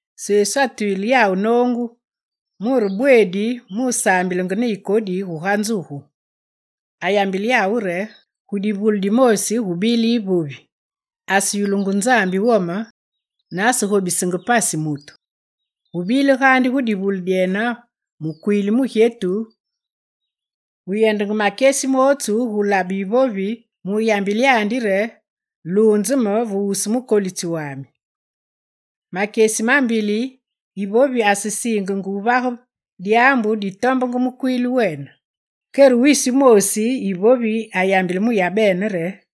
Sesu atwile yawu noongu muloonze re bweedi musaambilenge ne yikodi guga nzugu. Ayambile yawu re: «Gu divule dimoosi gubile yivovi aseyulungu Nzambi wome ne asegobisenge pasi mutu. Gu bile gaandi gu divule dyene mukwiili wu mugyetu wu yendenge makyesi mootsu gulabe yivovi mu yambile yandi re: “Luunze me ve wusu mukolitsi wami.” Makyesi ma mbili yivovi asesiingenge wuvage dyaambu ditombenge mukwiili wene. Kere wisi wumoosi yivovi ayambile mu yabene re: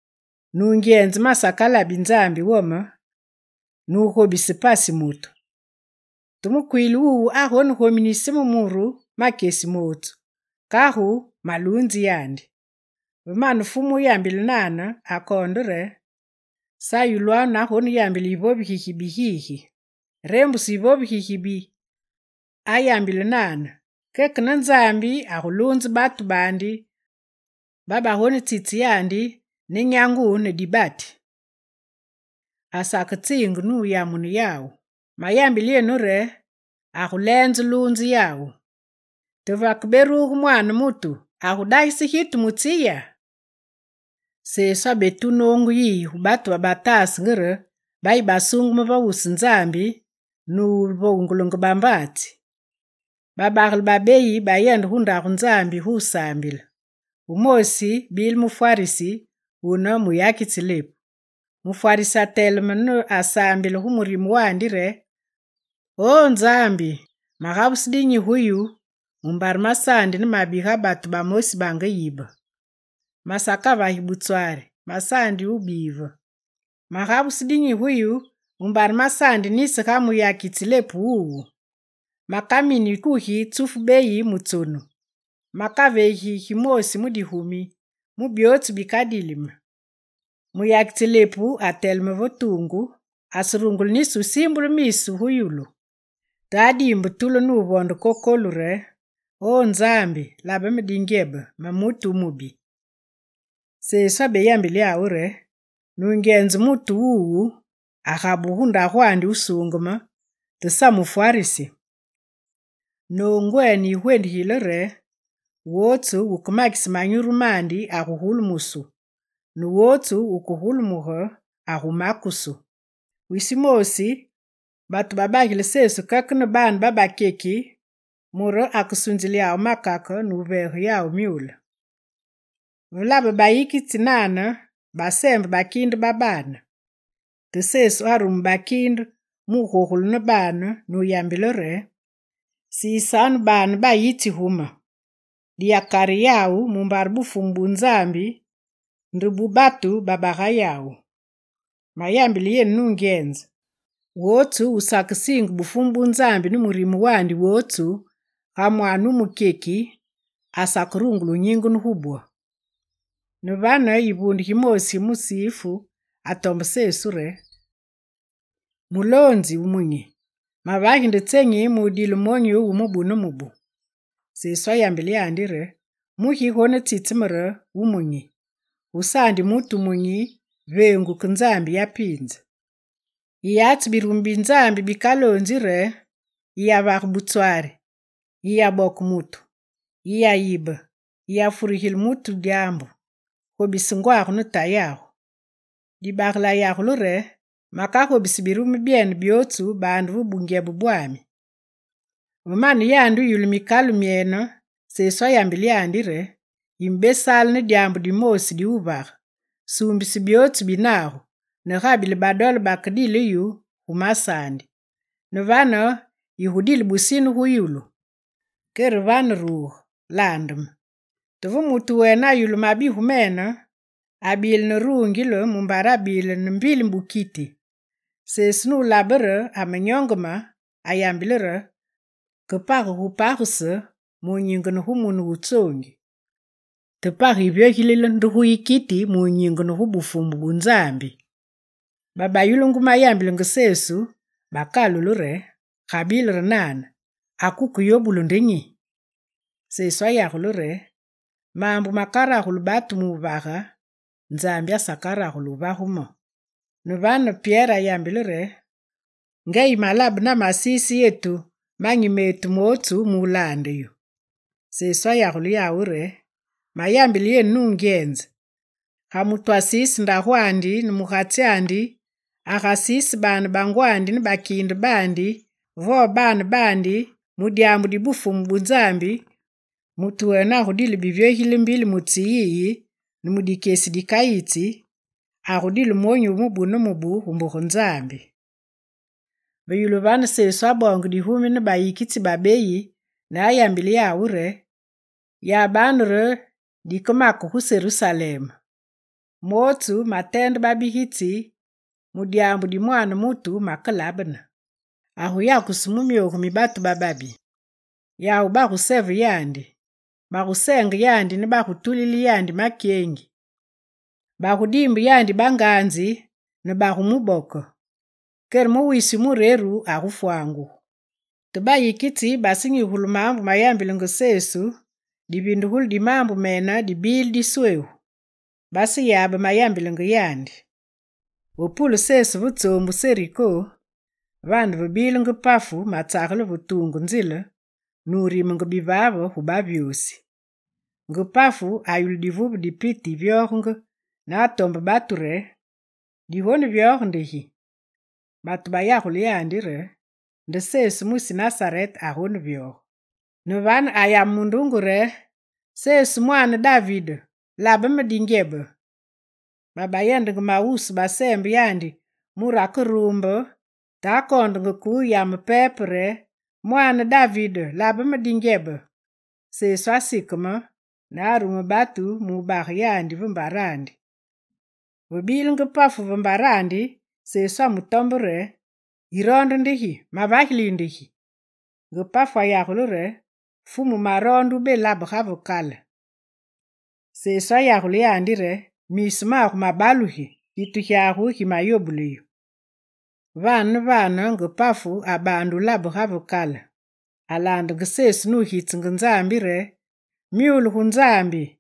“Nungyenze masakalabi Nzambi wome ne wugobisi pasi mutu. Te mukwiili wuwu agonegominise me muru makyesi mootsu, kagu maluunzi yandi.”» Ve mane Fumu wuyambile nane, akoonde re: «Sa yulwanu nagoneyambile yivovi gigibi gigi! Reembuse yivovi gigibi ayambile nane, keke ne Nzambya! Aguluunze batu baandi babagonetsitse yandi ne nyangu ne dibati. Asaketsiinge muyamune yawu. Mayambile yenu re aguleenze luunze yawu. Te vekeberuge Mwaane mutu, agudagise gitu mu tsi ya?» Sesu abetu noongu yiyi gu batu babataasenge re bayi basuungeme ve wusu Nzambi ne wuvoongulenge bambaatsi: «Babagele babeyi bayende gu ndagu Nzambi gusaambile; wumoosi bile mufwarisi, wune muyakitsi lepu. Mufwarisi ateleme ne asaambilenge gu murime wandi re: “O Nzambi, magabuse dinyi gu yu mumbare masaandi ne mabi ga batu bamosi bange yibe. Masakavagi butswari, masaandi wubive. Magabuse dinyi gu yu mumbare masaandi nisi ga muyakitsi wu lepu wuwu. Makamini kugi tsufu beyi mu tsonu. Makaveegi yu gimoosi mu digumi mu byootsu bikadili me.” Muyakitsi lepu ateleme ve tuungu. Aserungule nisi wusiimbule miisu gu yulu, te adiimbe tulu nuvonde kokolu re: “O Nzambi labe me dingyebe, me mutu wumubi.”» Sesu abeyambile yawu re: «Nungyenze mutu wuwu agabugu gu ndagwandi wusuungeme, te sa mufwarisi. Noongwene yigwendigile re: wootsu wukemakise manyuru mandi agugulumusu ne wootsu wukegulumuge agumakusu.» Wisi wumosi, batu babagile Sesu keke ne baane babakyeki mure akesunzile yawu makake nuveege yawu myule. Ve labe bayikitsi nane, baseembe bakiinde ba baane. Te Sesu arume bakiinde mugogule ne baane nuyambile re: «Sisanu baane bayitsi gu me, diyakare yawu mumbare Bufumu bu Nzambi nde bu batu baba ga yawu. Mayambile yenu nungyenze: wootsu wusakesiinge Bufumu bu Nzambi ne murime wandi wootsu ga mwaane wu mukyeki, asakerungule wunyingene gu bwo.» Ne vane, yivuunde gimoosi gi musifu atombe Sesu re: «Muloonzi wu munyi, mavagi nde gi mudile monyu wu mubu ne mubu?» Sesu ayambile yandi re: «Mugi yigonetsitse me re, wu munyi? Gusaandi mutu wu munyi veengu ke Nzambi ya piinze. Yiyatsi birumu bi Nzambi bikaloonzi re: “Yiyavage butswari, yiyaboke mutu, yiyayibe, yiyafurigile mutu dyaambu, gobise tayagu ne ngwagu.”» Dibagele ayagule re: «Makagobisi birumu byene byootsu baande ve bungyebe bwami.» Ve mane yandi wuyulu mikalu myene, Sesu ayambile yandi re: «Yimebesaale ne dyaambu dimoosi di wuvage: Suumbise byootsu bi nagu, ne gabile badole bakedile yu gu masaandi, ne vane yigudile busine gu yulu. Kere vane ruge, laande me.» Te ve mutu wene ayulu mabigu mene, abile ne rungile mumbare abile ne mbili bukiti. Sesu nulabe re amenyongeme, ayambile re: «Ke page gu pagese mu nyingene gu mune wu tsoongi. Te page yivyogilile gu yikiti munyingene gu Bufumu bu Nzambi!» Babayulungu mayambilenge Sesu bakalule re: «Gabile re nane, ake wukeyobulu nde nyi?» Sesu ayagule re: «Maambu makaragulu batu wugage, Nzambi asakaragulu wuvage mo.» Ne vane Pyere ayambile re: «Nga yimelabe namasiise yetu manyi metu mootsu mu laande yu.» Sesu ayagule yawu re: «Mayambile yenu nungyenze, ga mutu asiise ndagwandi ne mugatsyandi, agasiise baane bangwandi ne bakiinde baandi vo baane baandi mu dyaambu di Bufumu bu Nzambi, mutu wene agudile bivyogilile mbili gu tsi yiyi ne mu dikyesi dikayitsi, agudile monyu wu mubu ne mubu gu mbuge Nzambi.» Ve yulu vane, Sesu aboonge digumi ne bayikitsi babeyi ne ayambile yawu re: «Yabanu re dikemake gu Serusalem, mootsu mateende babigitsi mu dyaambu di Mwaane mutu makelabene. Aguyakusu mu myogu mi batu bababi. Yawu baguseve yandi, bagusenge yandi ne bagutulile yandi makyengi. Bagudiimbe yandi banganzi ne bagumuboke. Kere mu wisi wu mureru agufwangugu.» Te bayikitsi basenyigugulu maambu mayambilenge Sesu, divindugulu di maambu mene dibile disweegu. Baseyabe mayambilenge yandi. Ve pulenge Sesu ve tsoombu Seriko, vane vebile nge pafu matsagele ve tuungu nzile nurimenge bivaave gu bavyosi. Nge pafu ayulu divuve di piti yivyogenge ne atombe batu re: «Digonevyoge di nde gi?» Batu bayagule yandi re: «Nde Sesu mwisi Nasarete agonevyoge.» Ne vane ayame mundunge: «Sesu, Mwaane David, labe me dingyebe!» Babayendenge mawusu baseembe yandi mure akeruumbe te akoondenge ke wuyame pepe re: «Mwaane David, labe me dingyebe!» Sesu asikeme ne arume batu mubage yandi ve mbarandi. Ve bile nge pafu ve mbarandi, Sesu atombe yandi re: «Yiroonde nde gi? Mavagili yu nde gi?» Nge pafu ayagule yandi re: «Fumu maroonde wulabe ga ve kale!» Sesu ayagule yandi re: «Miisu magu mabalugi! Gitu gyagu gimayobule yu!» Vane ne vane nge pafu abaande wulabe ga ve kale. Alaandenge Sesu nugitsenge Nzambi re: «Myule gu Nzambi!»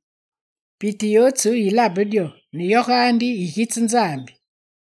Piti yootsu yilabe dyo ne yo gaandi yigitse Nzambi.